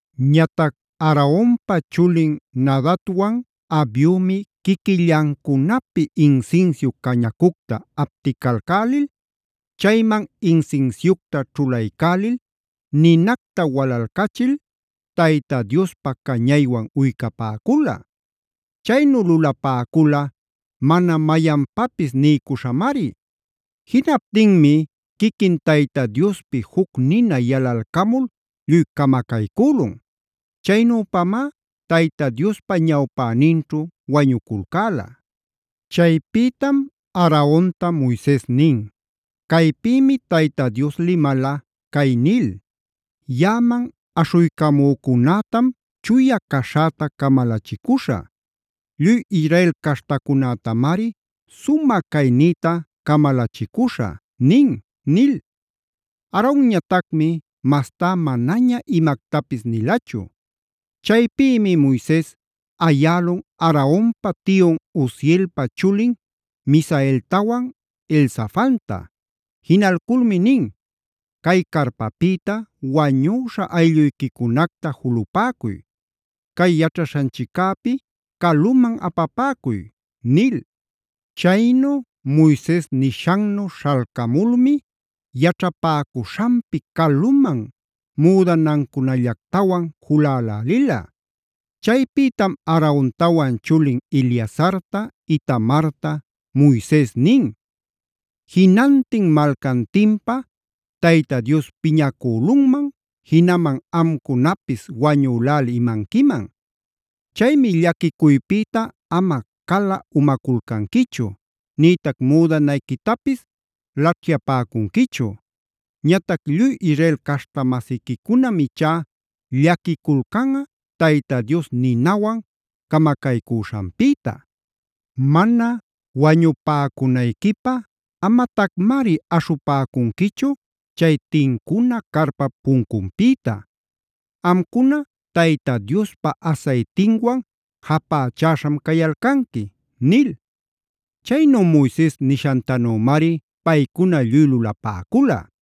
Ñatac Aaronpa chulin Nadabwan Abiumi quiquillancunapi insinsiu cañacucta apticalcälil, chayman insinsiucta ćhulaycälil ninacta walalcachil Tayta Diospä cañaywan uycapäcula. Chaynu lulapäcula mana mayanpapis niycuśhamari. Jinaptinmi quiquin Tayta Diospi juc nina yalalcamul lluy camacaycülun. Chaynüpamá Tayta Diospa ñawpäninćhu wañuculcäla. Chaypïtam Aaronta Moises nin: “Caypïmi Tayta Dios limala cay nil: ‘Yaꞌaman aśhuycamücunätam chuya caśhäta camalachicuśhä. Lluy Israel caśhtacunätamari sumä caynïta camalachicuśha’ nin” nil. Aaronñatacmi mastá manaña imactapis nilachu. Chaypïmi Moises ayälun Aaronpa tiyun Uzielpa chulin Misaeltawan Elzafanta. Jinalculmi nin: “Cay carpapïta wañüśha aylluyquicunacta julupäcuy. Cay yaćhaśhanchiccäpi caluman apapäcuy” nil. Chaynu Moises nishannu śhalcamulmi yaćhapäcuśhanpi caluman müdanancunallactawan julälälila. Chaypïtam Aarontawan chulin Eleazarta, Itamarta Moises nin: “Jinantin malcantinpa Tayta Dios piñacülunman, jinaman amcunapis wañüläli imanquiman. Chaymi llaquicuypïta ama cala-umaculcanquichu, nïtac müdanayquitapis laćhyapäcunquichu. Ñatac lluy Israel caśhta-masiquicunam ichá llaquiculcanꞌa Tayta Dios ninawan camacaycüśhanpïta. Mana wañupäcunayquipä amatacmari aśhupäcunquichu cay tincuna carpap puncunpïta. Amcuna Tayta Diospa asaytinwan japächäśham cayalcanqui” nil. Chaynu Moises nishantanümari paycuna lluy lulapäcula.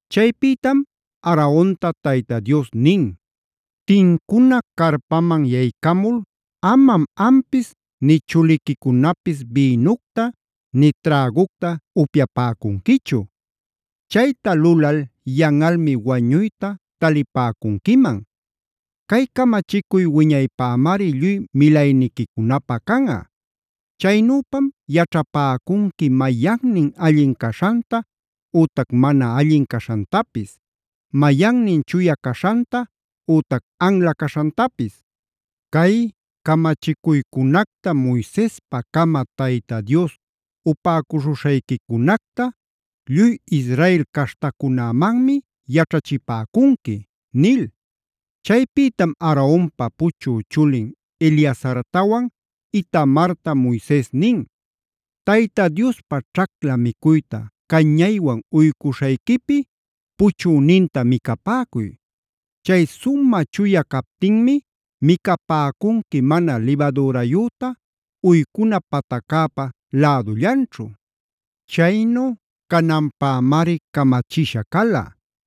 Chaypïtam Aaronta Tayta Dios nin: “Tincuna carpaman yaycamul amam ampis nï chuliquicunapis bïnucta nï trägucta upyapäcunquichu. Chayta lulal yanꞌalmi wañuyta talipäcunquiman. Cay camachicuy wiñaypämari lluy milayniquicunapä canꞌa. Chaynüpam yaćhapäcunqui mayannin allin caśhanta ütac mana allin caśhantapis; mayannin chuya caśhanta ütac anla caśhantapis. Cay camachicuycunacta Moisespacama Tayta Dios upäcuśhuśhayquicunacta lluy Israel caśhtacunämanmi yaćhachipäcunqui” nil. Chaypïtam Aaronpa puchü chulin Eleazartawan Itamarta Moises nin: “Tayta Diospa ćhacla micuyta cañaywan uycuśhayquipi puchüninta micapäcuy. Chay sumä chuya captinmi micapäcunqui mana libadürayüta uycuna pataccäpa lädullanćhu. Chaynu cananpämari camachisha cala: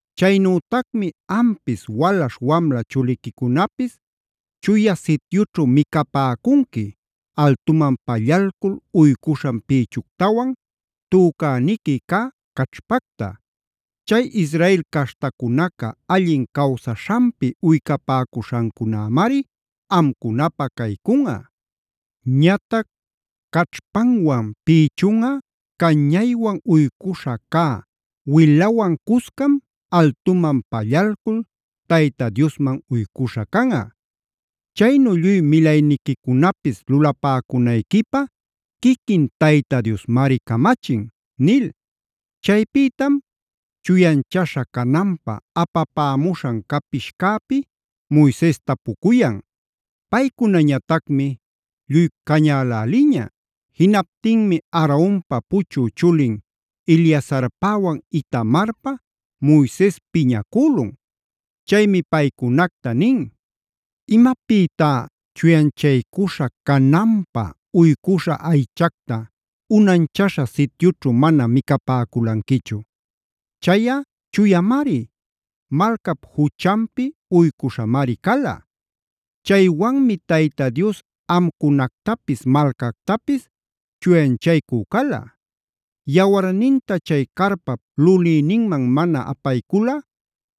Chaynütacmi ampis, walaśh wamla chuliquicunapis Chuya Sityućhu micapäcunqui: altuman pallalcul uycuśhan pïchuctawan, tücäniqui cä caćhpacta. Chay Israel caśhtacunaca allin cawsaśhanpi uycapäcuśhancunämari amcunapä caycunꞌa. Ñatac caćhpanwan pïchunꞌa cañaywan uycuśhä cä wilawan cuscam altuman pallalcul Tayta Diosman uycuśhä canꞌa. Chaynu lluy milayniquicunapis lulapäcunayquipä quiquin Tayta Diosmari camachin” nil. Chaypïtam chuyanchaśha cananpä apapämuśhan capishcäpi Moises tapucuyan. Paycunañatacmi, ¡lluy cañäläliña! Jinaptinmi Aaronpa puchü chulin Eleazarpäwan Itamarpä Moises piñacülun. Chaymi paycunacta nin: “¿Imapïtá chuyanchaycuśha cananpä uycuśhä aychacta unanchaśha sityućhu mana micapäculanquichu? Chayꞌa chuyamari; malcap juchanpi uycuśhamari cala.b Chaywanmi Tayta Dios amcunactapis, malcactapis chuyanchaycü cala. Yawarninta chay carpap lulïninman mana apaycuyalꞌa,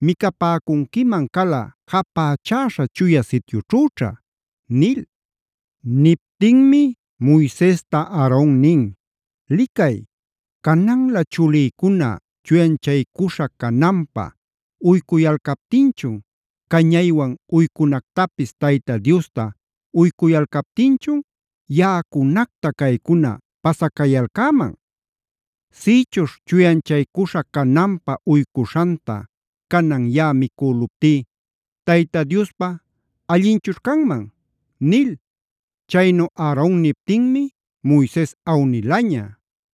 micapäcunquiman cala japächäśha Chuya Sityućhüćha” nil. Niptinmi Moisesta Aaron nin: “Licay, cananlä chulïcuna chuyanchaycuśha cananpä uycuyalcaptinchun, cañaywan uycunactapis Tayta Diosta uycuyalcaptinchun, yaꞌacunacta caycuna pasacayalcäman. Sïchuśh chuyanchaycuśha cananpä uycuśhanta canan yaꞌa micüluptí ¿Tayta Diospä allinchućh canman?” nil. Chaynu Aaron niptinmi Moises awnilaña.